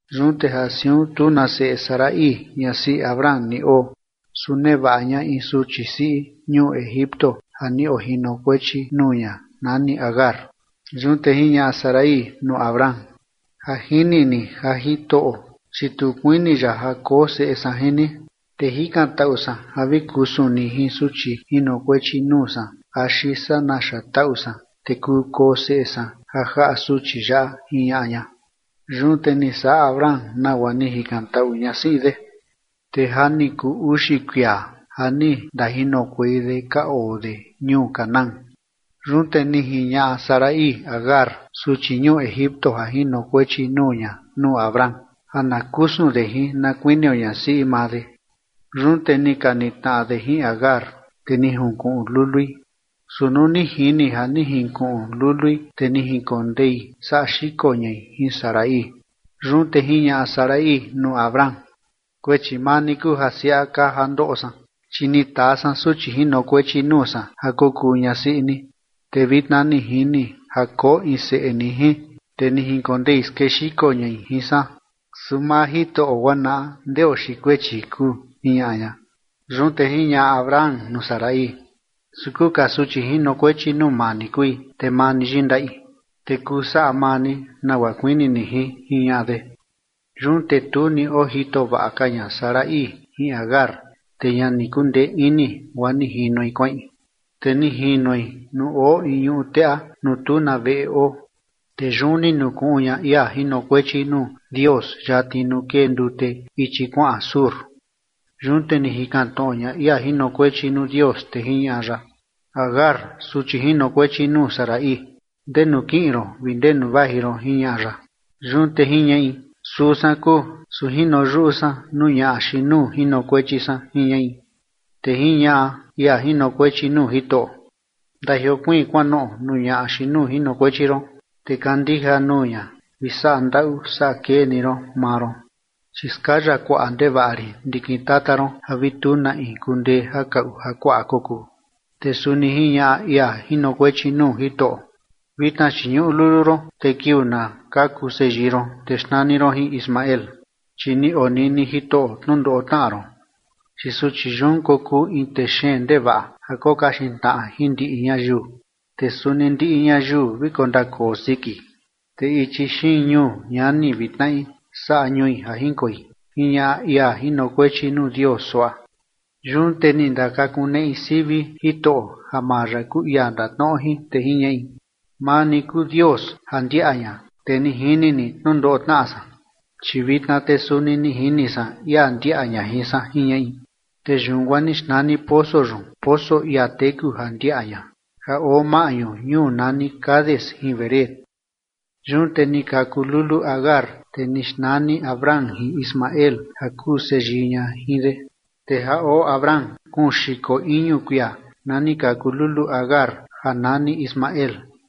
Yun te ja siun tu na seꞌe Sarai ñasiꞌi Abram ni oo, su nevaꞌa ña in suchi siꞌi ñuu Egipto ja ni ojinokuechi nuu ña, nani Agar. Yun te jiñaꞌa Sarai nuu Abram: ―Ja jini ni ja Jitoꞌo, chi tu kuini ya ja koo seꞌe san jin ni, te jikantaꞌu san ja vi kusun ni jin suchi jinokuechi nuu san axi saa naxa taꞌu san, te kuu koo seꞌe san ja jaꞌa suchi yaꞌa ―jiñaꞌa ña. Yun te ni saꞌa Abram nagua ni jikantaꞌu ñasiꞌi de. Te ja ni kuu uxi kuia ja ni ndajinokuei de ka oo de ñuu Canaán. Yun te ni jiñaꞌa Sarai Agar, suchi ñuu Egipto ja jinokuechi nuu ña nuu Abram ja na kusun de jin na kuinio ñasiꞌi maa de. Yun te ni ka nitnaꞌa de jin Agar, te ni jinkuꞌun lului, su nuu ni jini ja ni jinkuꞌun lului, te ni jinkondei saꞌa xiko ñai jin Sarai. Yun te jiñaꞌa Sarai nuu Abram: ―Kuechi maa ni kuu ja siaꞌa kaa ja ndoꞌo san, chi ni taa san suchi jinokuechi nuu san ja kokuu ñasiꞌi ni, te vitna ni jini ja koo in seꞌe ni jin, te ni jinkondei skexiko ñai jin san, su maa Jitoꞌo guaa naꞌa ndeo xiin kuechi kuu ―jiñaꞌa ña. Yun te jiñaꞌa Abram nuu Sarai: ―Su kuu ka suchi jinokuechi nuu maa ni kui, te maa ni yindaꞌi, te kuu saꞌa maa ni nagua kuini ni jin ―jiñaꞌa de. Yun te tu ni ojito vaꞌa ka ña Sarai jin Agar, te ña ni kundee ini guaa ni jinoi kuaꞌin. Te ni jinoi nuu oo in ñuꞌu teꞌa nuu tu na veꞌe oo, te yun ni nukuꞌun ña ia jinokuechi nuu Dios yatni nuu kee ndute ichi kuaꞌan Shur. Yun te ni jikan tnoꞌo ña ia jinokuechi nuu Dios, te jiñaꞌa ya: ―Agar, suchi jinokuechi nuu Sarai, ¿ndenu kiꞌin ron vi ndenu vaji ron? ―jiñaꞌa ya. Yun te jiñaꞌi: ―Suu san kuu, su jino yuꞌu san nuu ñaꞌa xiin nuu jinokuechi san ―jiñaꞌi. Te jiñaꞌa ia jinokuechi nuu Jitoꞌo: ―Ndajiokuiin kuanoꞌo nuu ñaꞌa xiin nuu jinokuechi ron, te kandija nuu ña vi saꞌa ndaꞌu saꞌa kee ni ron maa ron, chi skaya kuaꞌa ndevaꞌa rin ndikin tata ron ja vi tu na in kundee ja kaꞌu ja kuaꞌa kokuu. Te suni jiñaꞌa ia jinokuechi nuu Jitoꞌo: Vitna chi ñuꞌu lulu ron te kiuu na kaku seyii ron te xnani ron jin Ismael chi ni onini Jitoꞌo tnundoꞌo tnaꞌa ron. Chi suchi yun kokuu in tee xeen ndevaꞌa ja kokaxin tnaꞌa jin ndiꞌi ñayiu. Te suni ndiꞌi ñayiu vi kondakoo siki, te ichi xiin ñuu ñani vi tnaꞌi saꞌa ñui ja jinkoi, jiñaꞌa ia jinokuechi nuu Dios suaꞌa. Yun te ni ndakakuneꞌi sivi Jitoꞌo ja maa ya kuu ia ndatnoꞌo jin, te jiñaꞌi: ―Maa ni kuu Dios ja ndiaꞌa ña, te ni jini ni tnundoꞌo tnaꞌa san, chi vitna te suni ni jini san, ia ndiaꞌa ña jin san ―jiñaꞌi. Te yun guaa ni xnani poso yun poso ia teku ja ndiaꞌa ña, ja oo maꞌñu ñuu nani Cades jin Bered. Yun te ni kaku lulu Agar, te ni xnani Abram jin Ismael ja kuu seyii ña jin de. Te ja oo Abram kuun xiko iñu kuia na ni kaku lulu Agar ja nani Ismael.